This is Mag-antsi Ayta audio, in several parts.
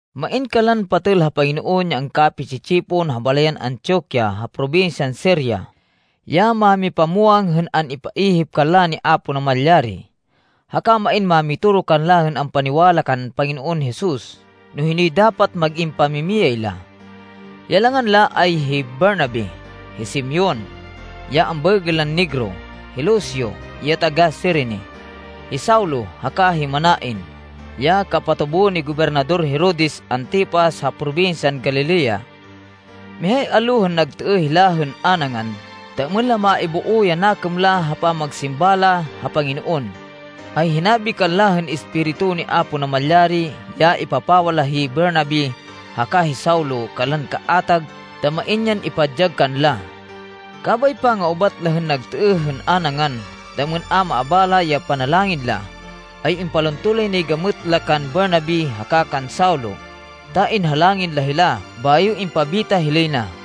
Main kanlan patêl ha Panginoon ya angkapi-tsi-tsipon, ha balayan Antioquia ha probinsyan Siria, ya mámipamwang hên an-ipaihip kanla ni Apo Namalyari, haka main mámitoro kanlan ampaniwala kan Panginoon Jesus no hinoy dapat mag-in pamimiyay la. Ya langan la ay hi Bernabe, hi Simeon, ya ambaêgên lan Negro, hi Lucio ya taga-Cirene, hi Saulo, haka hi Manaen, ya kapatubo ni Gobernador Herodes Antipas ha probinsyan Galilea. Mihay allo hên nagtêêh hila hên a nangan ta êmên la maiboo ya nakêm la ha pamagsimba la ha Panginoon, ay hinabi kanla hên Espiritu ni Apo Namalyari ya ipapawa la hi Bernabe haka hi Saulo kanlan kaatag ta main yan ipadyag kanla. Kabay panga-ubat la hên nagtêêh hên a nangan, ta êmên a maabala ya panalangin la, ay impalunto lay nay gamêt la kan Bernabe haka kan Saulo ta inhalangin la hila bayo impabita hilay na.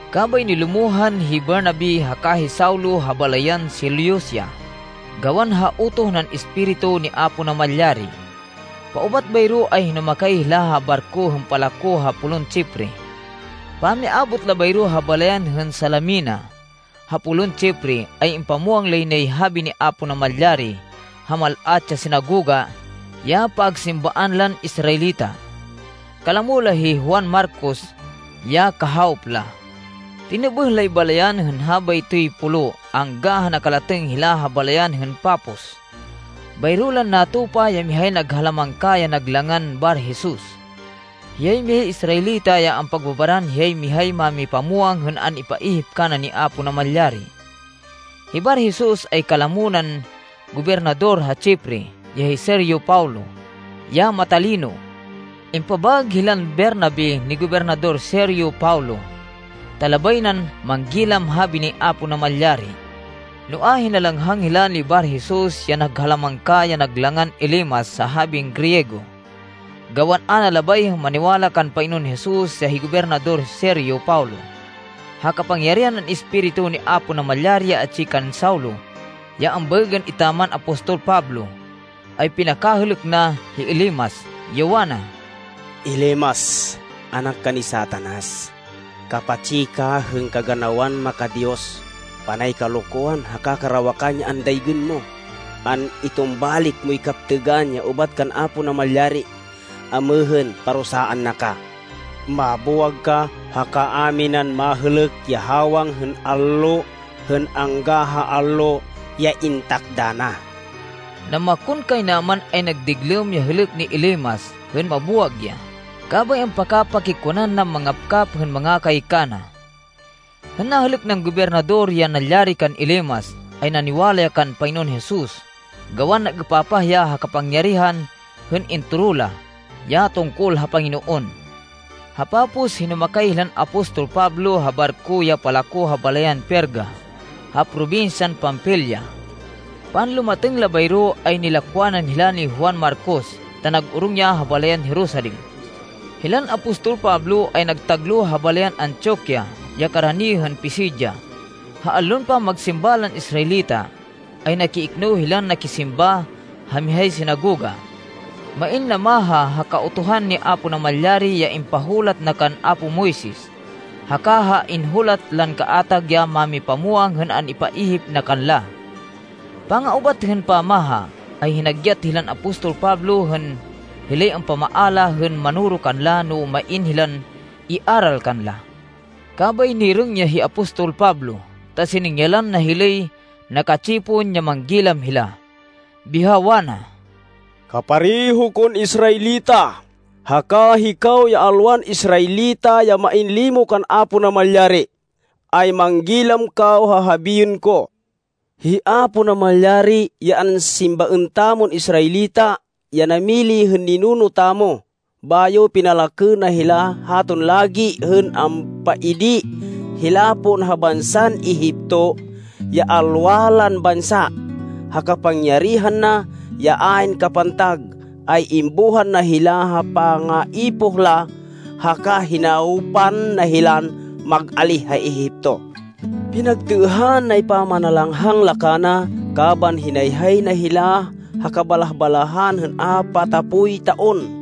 Kabay nilumohan hi Bernabe haka hi Saulo ha balayan Seleucia gawan ha utoh nan Espiritu ni Apo Namalyari. Paubat bayro ay hinumakay hila ha barko hên palako ha polun Chipre. Pamiabot la bayro ha balayan hên Salamina, ha polun Chipre, ay impamwang lay nay habi ni Apo Namalyari ha mal-at ya sinagoga ya pagsimbaan lan Israelita. Kalamo la hi Juan Marcos ya kahawop la. Tinêbêh lay balayan hên habaytoy pulo angga ha nakalatêng hila ha balayan hên Pafos. Bayro lan natupa ya mihay naghalamangka ya nag langan Bar-Jesus. Hiyay mihay Israelita ya ampagbabaran hiyay mihay mámipamwang hên an-ipaihip kana ni Apo Namalyari. Hi Bar-Jesus ay kalamo nan gobernador ha Chipre, ya hi Sergio Paulo, ya matalino. Impabaêg hilan Bernabe ni Gobernador Sergio Paulo ta labay nan manggilam habi ni Apo Namalyari. Noa, hinalanghang hila ni Bar-Jesus ya naghalamangka, ya nag langan Elimas ha habin Griego, gawan a na labay hên maniwala kan Panginoon Jesus, ya hi Gobernador Sergio Paulo. Ha kapangyarihan nan Espiritu ni Apo Namalyari ya atsi kan Saulo, ya ambaêgên etaman apostol Pablo, ay pinakahêlêk na, hi Elimas, ya wana, “Elimas, anak ka ni Satanas! Kapatsi ka hên kaganawan maka-Diyos. Panay kalokwan haka karawakan ya andaygên mo. An-itumbalik moy kaptêgan ya ubat kan Apo Namalyari. Amêhên parusaan na ka. Mabuwag ka haka a minan mahêlêk ya hawang hên allo hên angga ha allo ya intakda na.” Namakonkaynaman ay nagdiglêm ya hêlêk ni Elimas hên mabuwag ya, kabay ampakapakikwanan nan mangapkap hên mangakay kana. Hên nahêlêk nan gobernador ya nalyari kan Elimas, ay naniwala ya kan Panginoon Jesus gawan nag-êpapah ya ha kapangyarihan hên intoro la, ya tungkol ha Panginoon. Ha Pafos, hinumakay hilan apostol Pablo ha barko ya palako ha balayan Perga ha probinsyan Panfilia. Panlumatêng la bayro ay nilakwanan hila ni Juan Marcos ta nag-orong ya ha balayan Jerusalem. Hilan apostol Pablo ay nagtagloh ha balayan Antioquia ya karani hên Pisidia. Ha allon pamagsimba lan Israelita, ay nakiikno hilan nakisimba ha mihay sinagoga. Main namaha ha Kautuhan ni Apo Namalyari ya impahulat na kan apo Moises, haka ha inhulat lan kaatag ya mámipamwang hên an-ipaihip na kanla. Panga-ubat hên pamaha, ay hinagyat hilan apostol Pablo hên hilay ampamaala, hên manoro kanla no main hilan iaral kanla. Kabay nirêng ya hi apostol Pablo ta siningyalan na hilay naka-tsipon ya manggilam hila, biha wana, “Kapareho kon Israelita, haka hikaw ya alwan Israelita ya main limo kan Apo Namalyari, ay manggilam kaw ha habiên ko. Hi Apo Namalyari, ya ansimbaên tamon Israelita, ya namili hên ninuno tamo, bayo pinalakê na hila haton lagi hên ampaidi hila pon ha bansan Egipto, ya alwa lan bansa. Ha kapangyarihan na, ya ayn kapantag, ay imbuhan na hila ha pangaipoh la haka hinawpan na hilan mag-alíh ha Egipto. Pinagtêêhan nay pamanalanghang la kana kaban hinayhay na hila ha kabalah-balahan hên apatapoy taon.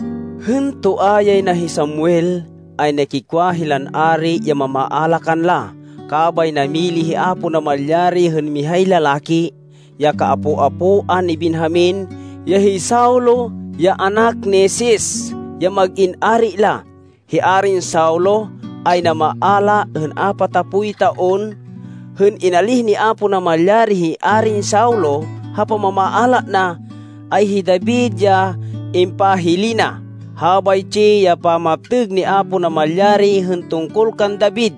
Hên toa yay na hi Samuel, ay nakikwa hilan ari ya mamaala kanla, kabay namili hi Apo Namalyari hên mihay lalaki, ya kaapo-apoan ni Benjamin, ya hi Saulo, ya anak ni Cis, ya mag-in ari la. Hi Arin Saulo ay namaala hên apatapoy taon. Hên inalíh ni Apo Namalyari hi Arin Saulo ha pamamaala na, ay hi David ya impahili na. Habaytsi ya pamaptêg ni Apo Namalyari hên tungkol kan David,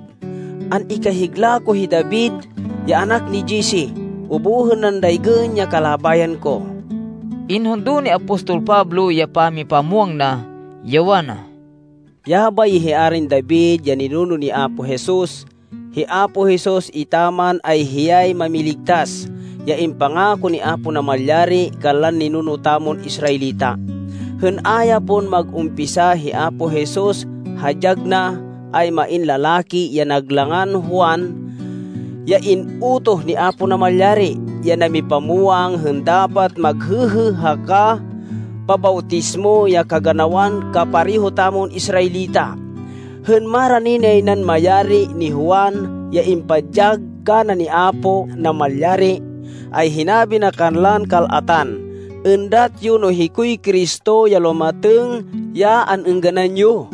‘An-ikahigla ko hi David ya anak ni Jesse. Ubuhên nan daygên ya kalabayan ko.’” Inhundo ni apostol Pablo ya pamipamwang na, ya wana, “Yabay ya hi Arin David ya ninuno ni Apo Jesus. Hi Apo Jesus etaman, ay hiyay Mámiligtas, ya impangako ni Apo Namalyari kanlan ninuno tamon Israelita. Hên a ya pon mag-umpisa hi Apo Jesus ha dyag na, ay main lalaki ya nag langan Juan, ya in-utoh ni Apo Namalyari, ya namipamwang hên dapat maghêhê haka pabawtismo ya kaganawan kapareho tamon Israelita. Hên marani nay nan mayari ni Juan ya impadyag kana ni Apo Namalyari, ay hinabi na kanlan kal-atan, ‘Êndat yo no hikoy Cristo ya lumatêng ya an-êngganan yo!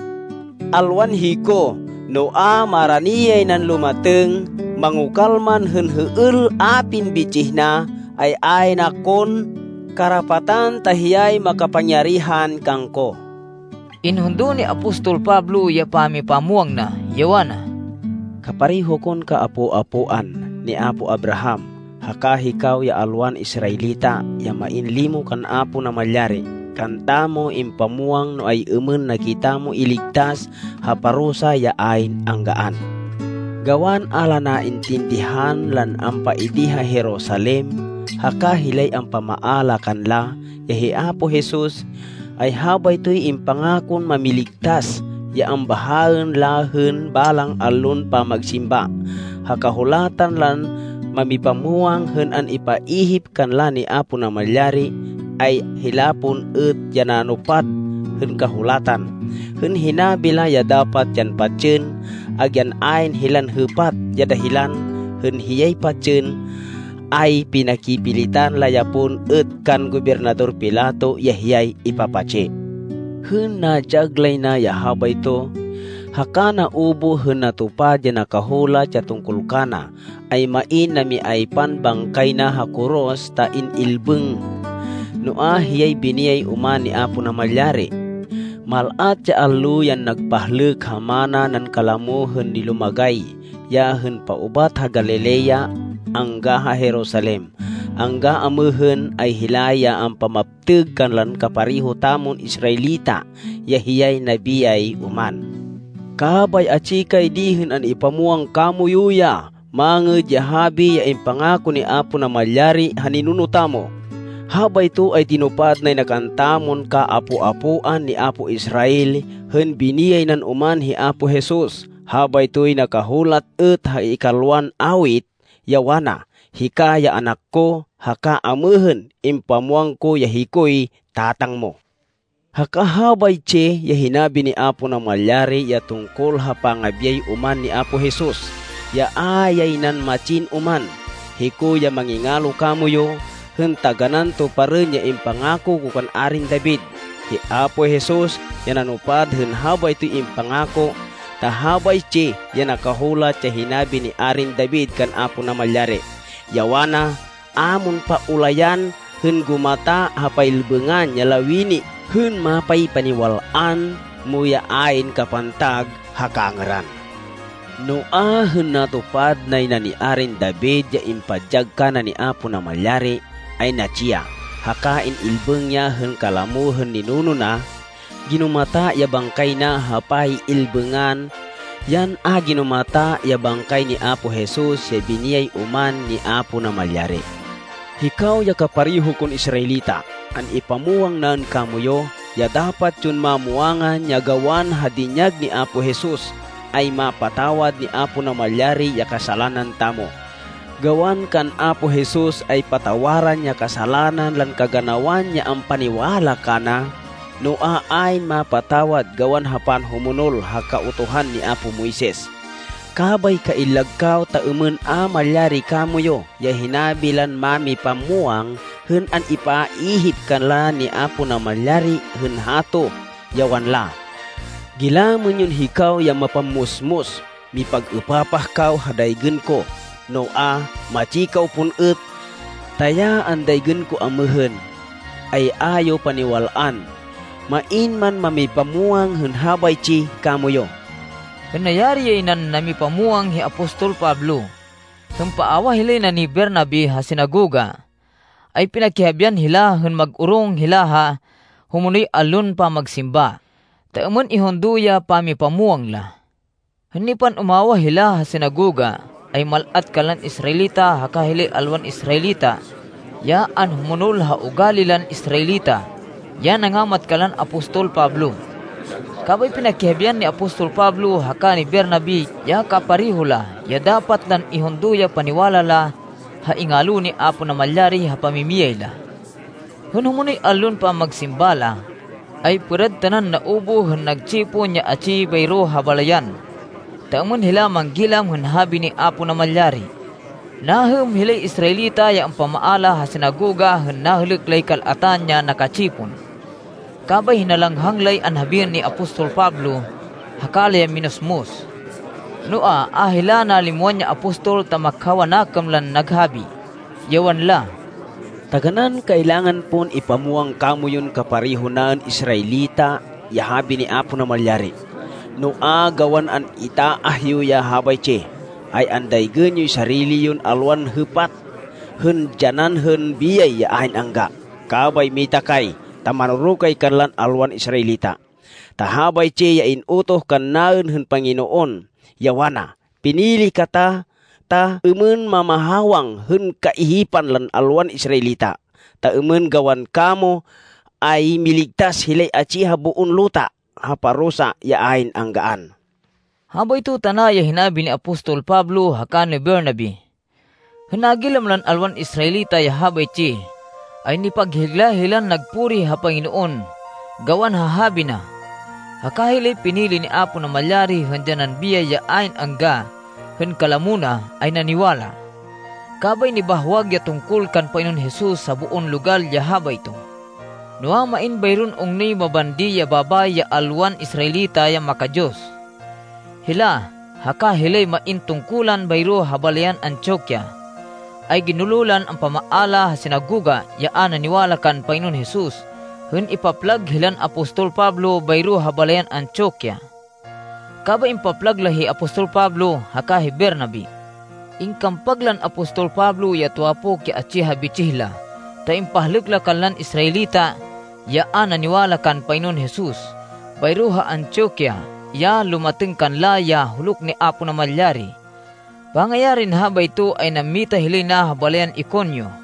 Alwan hiko. Noa, marani yay nan lumatêng. Mangokal man hên hêêl apin bitsih na, ay ayn akon karapatan ta hiyay makapangyarihan kangko.’” Inhundo ni apostol Pablo ya pamipamwang na, ya wana, “Kapareho kon kaapo-apoan ni apo Abraham, haka hikaw ya alwan Israelita ya main limo kan Apo Namalyari, kantamo impamwang no ay-êmên na kitamo iligtas ha parusa ya ayn anggaan. Gawan a la naintindihan lan ampaidi ha Jerusalem haka hilay ampamaala kanla, ya hi Apo Jesus, ay habaytoy impangakon Mámiligtas, ya ambahaên la hên balang allon pamagsimba, ha Kahulatan lan mámipamwang hên an-ipaihip kanla ni Apo Namalyari, ay hila pon êt ya nanupad hên Kahulatan, hên hinabi la ya dapat yan patsên. Agyan ayn hilan hêpat ya dahilan hên hiyay patsên, ay pinakipilitan la ya pon êt kan Gobernador Pilato ya hiyay ipapatsi. Hên nadyag lay na ya habayto, haka naubuh hên natupad ya nakahulat ya tungkol kana, ay main namiaypan bangkay na ha koros ta in-ilbêng. Noa, hiyay biniyay oman ni Apo Namalyari. Mal-at ya allo yan nagpahlêk ha mana nan kalamo hên nilumagay ya hên paubat ha Galilea angga ha Jerusalem. Angga amêhên, ay hila ya ampamaptêg kanlan kapareho tamon Israelita ya hiyay nabiyay oman. Kabay atsi kay di hên an-ipamwang kamoyu ya Mangêd ya Habi ya impangako ni Apo Namalyari ha ninuno tamo. Habayto ay tinupad nay na kantamon kaapo-apoan ni apo Israel, hên biniyay nan oman hi Apo Jesus. Habaytoy nakahulat êt ha ikalwan Awit, ya wana, ‘Hika ya anak ko, haka amêhên impamwang ko ya hikoy Tatang mo.’ Haka habaytsi ya hinabi ni Apo Namalyari ya tungkol ha pangabiyay oman ni Apo Jesus, ya a yay nan matsin oman, ‘Hiko ya mangingalo kamoyu, hên taganán tuparên ya impangako ko kan Arin David.’ Hi Apo Jesus ya nanupad hên habaytoy impangako, ta habaytsi ya nakahulat ya hinabi ni Arin David kan Apo Namalyari, ya wana, ‘A mon paulayan hên gumata ha pay-ilbêngan ya lawini hên mapaypaniwal-an mo ya ayn kapantag ha kangêran.’ Noa, hên natupad nay na ni Arin David ya impadyag kana ni Apo Namalyari, ay natsi ya, haka in-ilbêng ya hên kalamo hên ninuno na. Ginumata ya bangkay na ha pay-ilbêngan. Yan a ginumata ya bangkay ni Apo Jesus ya biniyay oman ni Apo Namalyari. Hikaw ya kapareho kon Israelita, an-ipamwang naên kamoyu, ya dapat yon mamwangan, ya gawan ha dinyag ni Apo Jesus, ay mapatawad ni Apo Namalyari ya kasalanan tamo. Gawan kan Apo Jesus ay patawaran ya kasalanan lan kaganawan ya ampaniwala kana. Noa, ayn mapatawad gawan ha pamanhumonol ha Kautuhan ni apo Moises. Kabay kaillag kaw ta êmên a malyari kamoyu ya hinabi lan mámipamwang hên an-ipaihip kanla ni Apo Namalyari hên hato, ya wanla, ‘Gilamên yon, hikaw ya mapammusmus! Mipag-êpapah kaw ha daygên ko, noa, matsi kaw pon êt! Ta ya andaygên ko amêhên, ay a yo paniwal-an, main man mamipamwang hên habaytsi kamoyu!’” Hên nayari yay nan namipamwang hi apostol Pablo, hên paawah hilay na ni Bernabe ha sinagoga, ay pinakihabian hila hên mag-orong hila ha humonoy allon pamagsimba, ta êmên ihundo ya pamipamwang la. Hên nipan-umawah hila ha sinagoga, ay mal-at kanlan Israelita haka hilay alwan Israelita, ya anhumonol ha ugali lan Israelita, ya nangamat kanlan apostol Pablo. Kabay pinakihabian ni apostol Pablo haka ni Bernabe ya kapareho la ya dapat lan ihundo ya paniwala la ha ingalo ni Apo Namalyari ha pamimiyay la. Hên humonoy allon pamagsimba la, ay pêrad tanan naubuh hên nagtsipon ya atsi bayro ha balayan, ta êmên hila manggilam hên habi ni Apo Namalyari. Nahêm hilay Israelita ya ampamaala ha sinagoga hên nahêlêk lay kal-atan ya naka-tsipon. Kabay hinalanghang lay anhabiên ni apostol Pablo haka la ya minusmus. Noa, a hila nalimwan ya apostol ta makhaw a nakêm lan naghabi, ya wanla, “Taganán kailangan pon ipamwang kamoyun kapareho naên Israelita ya habi ni Apo Namalyari. Noa, gawan an-itaah yo ya habaytsi, ay andaygên yoy sarili yon alwan hêpat hên dyanan hên biyay ya ayn angga. Kabay mita kay, ta manoro kay kanlan alwan Israelita. Ta habaytsi ya in-utoh kannaên hên Panginoon, ya wana, ‘Pinili kata ta êmên mamahawang hên kaihipan lan alwan Israelita, Ta êmên gawan kamo, ay miligtas hilay atsi ha boon luta ha parusa ya ayn anggaan.’” Habayto tana ya hinabi ni apostol Pablo haka ni Bernabe. Hên nagilam lan alwan Israelita, ya habaytsi, ay nipaghigla hilan nagpuri ha Panginoon gawan ha habi na. Haka hilay pinili ni Apo Namalyari hên dyanan biyay ya ayn angga hên kalamo na, ay naniwala. Kabay nibahwag ya tungkol kan Panginoon Jesus ha boon logal ya habayto. Noa, main bayron ungnoy mabandi ya babayi ya alwan Israelita, ya maka-Diyos. Hila, haka hilay main tungkulan bayro ha balayan Antioquia, ay ginulo lan ampamaala ha sinagoga, ya a naniwala kan Panginoon Jesus hên ipaplag hilan apostol Pablo bayro ha balayan Antioquia. Kabay impaplag la hi apostol Pablo haka hi Bernabe. Ingkampag lan apostol Pablo ya tuwapok ya atsi ha bitsih la ta impahlêk la kanlan Israelita, ya a naniwala kan Panginoon Jesus bayro ha Antioquia, ya lumatêng kanla ya huluk ni Apo Namalyari. Pangayarin habayto, ay nammita hilay na ha balayan Iconio.